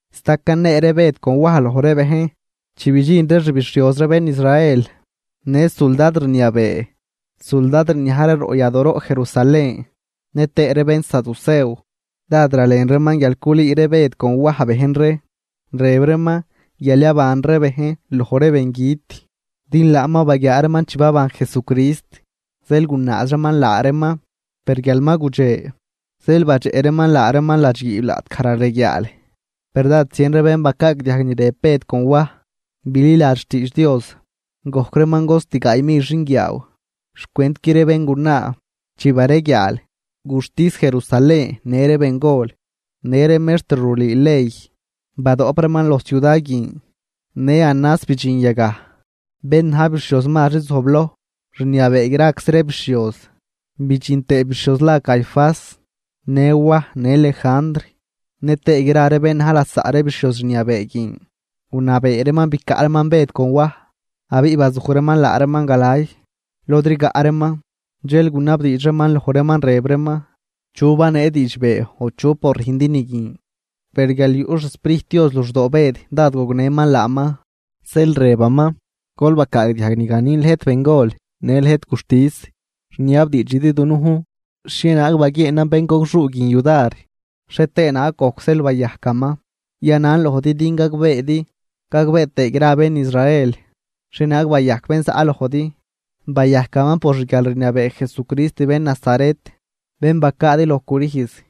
Sta canee ree Bëd con Waj loj ree bejn, chi bidxin ree xbixhioz ree bén Israel në suldad rniabee suldad rniaj ree roꞌ yadooroꞌ Jerusalén, nëtëë ree bénsaducew. Dád ralen reeman guial culüü ree Bëd con Waj bejn ree, rëb reeman guial yaban ree bejn loj ree bengüt, din laan ma baguiaa reeman chi baban Jesucrist. Zeel gunaaz reeman laa reeman, per guial ma gudxe, zeel badxeꞌ reeman laa reeman ladxguiib laꞌtgaj rareguiaal. Per dád zien ree bén bacaagdiajg ni rëb ree Bëd con Waj bililadx xtiidx Dios, gojc reeman cost gaay mil xinguiaaw xcwentqui ree béngunaa. Chi bareguiaal, guxtis Jerusalén në ree bengol në ree mextr rulüü ley, badoꞌp reeman loj ciuda guin. Në Anás bidxin yagaj, bén na̱j bixhioz mazri zojbloj rniabee graczi ree bixhioz, bidxin tëë bixhioz la Caifás në Waj në Lejandr, nëtëë gra ree bén na̱j lasaꞌ ree bixhioz rniabee guin. Gunabee reeman bicaꞌ reeman Bëd con Waj, abiꞌ bazuj reeman laa reeman galay lod rigaꞌ reeman, dxel gunabdiidx reeman loj reeman, rëb reeman: ―¿Chu banee diidxbee o chu por rüjndi ni guin? Per guial yuꞌ xSprijt Dios luxdoo Bëd dád gognëman laaman, zeel rëbaman: ―Gol bacaagdiajg ni ganin lëjt bengol në lëjt guxtis, rniabdiidxidi dunujn xhienaag baguieenan béngogxuu guin yudar, xhie tëë naag gojc zeel bayajcaman. Yanan lojdi din gagbeedi gagbee tëë gra bén Israel xhienaag bayajc bén zaꞌ lojdi. Bayajcaman por xguialrniabee Jesucrist bén Nazaret, bén bacaadi loj crüjz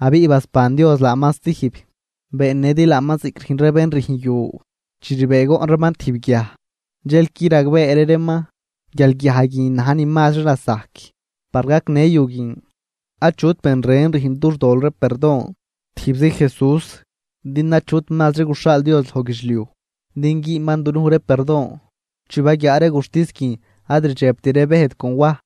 abiꞌ basban Dios laaman stijb. Beennëdi laaman ziꞌc rüjn ree bén rüjn yu chi rbëëgoꞌn reeman tijb guiaj, dxel qui ragbeeri reeman guial guiaj guin na̱j ni mazri lasajc par gacnë yu guin. Achut ben ren rüjn dux tol ree perdon, tijbzi Jesús, din achut mazri guxhaal Dios loj guidxliuj din güünman dunuj ree perdon. Chi baguiaa ree guxtis guin ad rdxebt ree Bëd con Waj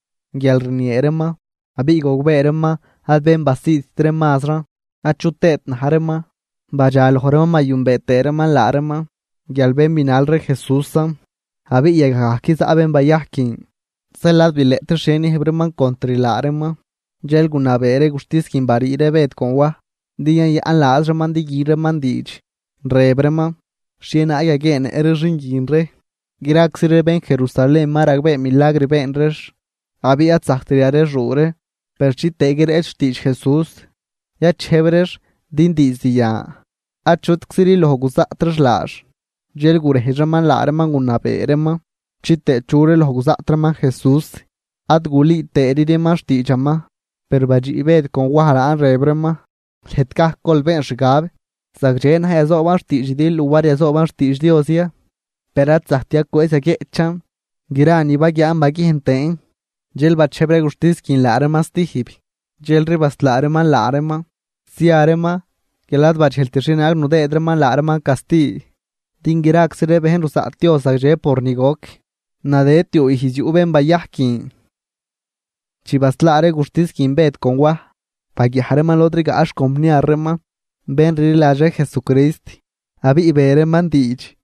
guial rniee reeman, abiꞌ gogbee reeman ad bén basiidt ree mazran achu tëët na̱j reeman, badxa loj reeman bayünbee tëë reeman laa reeman guial bén binal ree Jesúsan. Abiꞌ yagaj gajc zaꞌ bén bayajc guin, zeel ad bileꞌtri xhie niëjb reeman contr laa reeman. Dxel gunabee ree guxtis guin barii ree Bëd con Waj din yayaꞌn laaz reeman din gü reeman diidx. Rëb reeman: ―¿Xhienaag yaguieennëꞌ ree xin guin ree? Graczi ree bén Jerusalén ma ragbee milagr been reex. Abiꞌ ad zajct yarexuu ree. Per chitëë guireꞌch xtiidx Jesús, yachejb reex din diizd yan achutcziri loj guzaꞌt reex laax. Dxel gurejdx reeman laa reeman gunabee reeman chitëë churi loj guzaꞌt reeman Jesús, ad gulüü tëëri reeman xtiidxaman. Per badxiꞌ Bëd con Waj laan, rëb reeman: ―Lëjt gajc gol been xgab: ¿Zagdxe na̱j yazooban xtiidxidi luar yazooban xtiidx Dios ya? Per ad zajct yacwëëz yaguieꞌchan gra ni baguiaan baguiejn tëën. Dxel bachejb ree guxtis guin laa reeman stijb, dxelri baslaa reeman laa reeman zia reeman guial ad badxejlt xhienaag nudëëd reeman laa reeman casti, din graczi ree bejn ruzaꞌt Dios zagdxe por ni goc. Nadëd tiuu ijz yuꞌ bén bayajc guin. Chi baslaa ree guxtis guin Bëd con Waj, baguiaj reeman lod rigaꞌ xcompniar reeman bén rliladx ree Jesucrist, abiꞌ be reeman diidx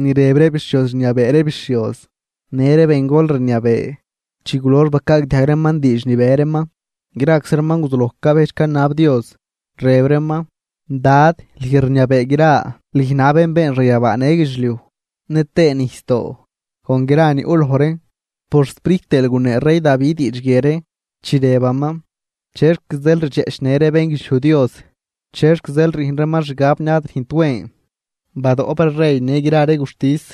ni rëb ree bixhioz rniabee ree bixhioz në ree bengol rniabee. Chi gulox bacaagdiajg reeman diidx ni be reeman, graczi reeman guzuloj cabejdx canab Dios, rëb reeman: ―Dad lüj rniabee gra, lüj na̱j bén been xanyabaa në guidxliuj nëtëë nijsdoo con gra ni yuꞌ loj reen. Por xSprijt tëël gunee rey Davi diidx guie ree, chi rëbaman: ¿Chexc zeel ridxeꞌchnë ree bénguidxliuj Dios? ¿Chexc zeel rüjn reeman xgab ni ad rüjnt wen? Badoꞌp ree rey në gra ree guxtis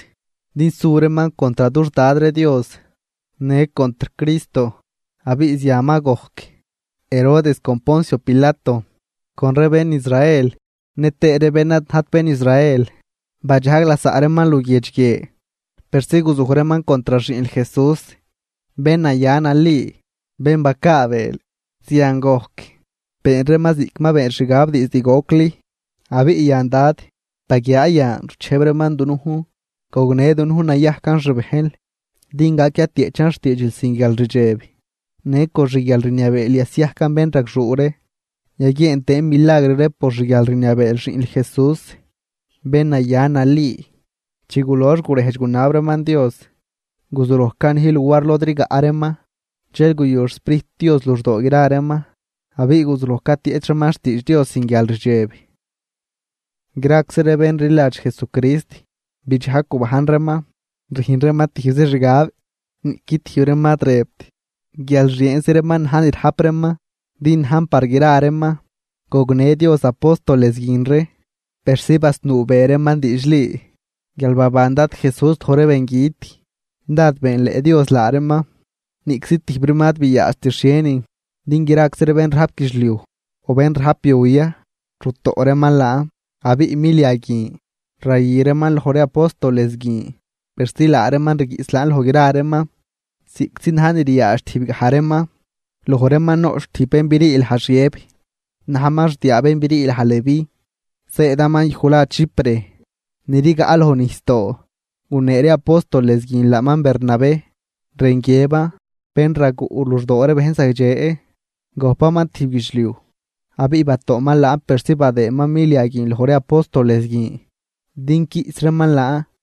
din su reeman contr dux Dad ree Dios në contr Cristo. ’Abiꞌ zian ma gojc, Herodes con Poncio Pilato con ree bén Israel nëtëë ree bén ad najt bén Israel, badxajg lasaꞌ reeman luguiedx guie persi guzuj reeman contr xiꞌnl Jesús, bén naya nali, bén bacaabeel. Zian gojc, been reeman ziꞌc ma beenl xgab diizd gocli. Abiꞌ yan Dad, baguiaa yan ruchejb reeman dunujn. Gognë dunujn nayajcan xbejnl din gac yatieꞌchan xtiidxil sin guialrdxeb, në con xguialrniabeel yasiajcan bénragxuu ree, yaguieen tëën milagr ree por xguialrniabee xiꞌnl Jesús, bén naya nali. Chi gulox gurejdx gunab reeman Dios, guzuloj canij luar lod rigaꞌ reeman, dxel guyu xSprijt Dios luxdoo gra reeman, abiꞌ guzuloj catieꞌch reeman xtiidx Dios sin guialrdxeb. Graczi ree bén rliladx Jesucrist bidxajg gubajn reeman, rüjn reeman tijbzi xgab, niꞌqui tijb reeman ad rëbt guial xieenzi reeman na̱j ni rajp reeman, din najn par gra reeman. Gognë Dios apóstoles guin ree persi basnuu be reeman diidxli guial baban Dad Jesús loj ree bengüt. Dád beenleꞌ Dios laa reeman. Niꞌczi tijb reeman ad biaadxt xhienin, din graczi ree bén rajp guidxliuj o bén rajp yu ya rutoꞌ reeman laan, abiꞌ milia guin rayü reeman loj ree apóstoles guin, persi laa reeman rguiꞌs laan loj gra reeman ziꞌctzi na̱j ni riaadx tijb gaj reeman. Loj reeman noꞌch tijb bén brii laj Xiëb, najman xdiaa bén brii laj Leví, zëëdaman yuj la Chipre ni rigaꞌ loj nijsdoo. Gunee ree apóstoles guin laaman Bernabé, rën guiëban Bén raguꞌ luxdoo ree bejn zagdxe. Gojpaman tijb guidxliuj, abiꞌ batoꞌman laan persi badëëman milia guin loj ree apóstoles guin din quiꞌs reeman laan.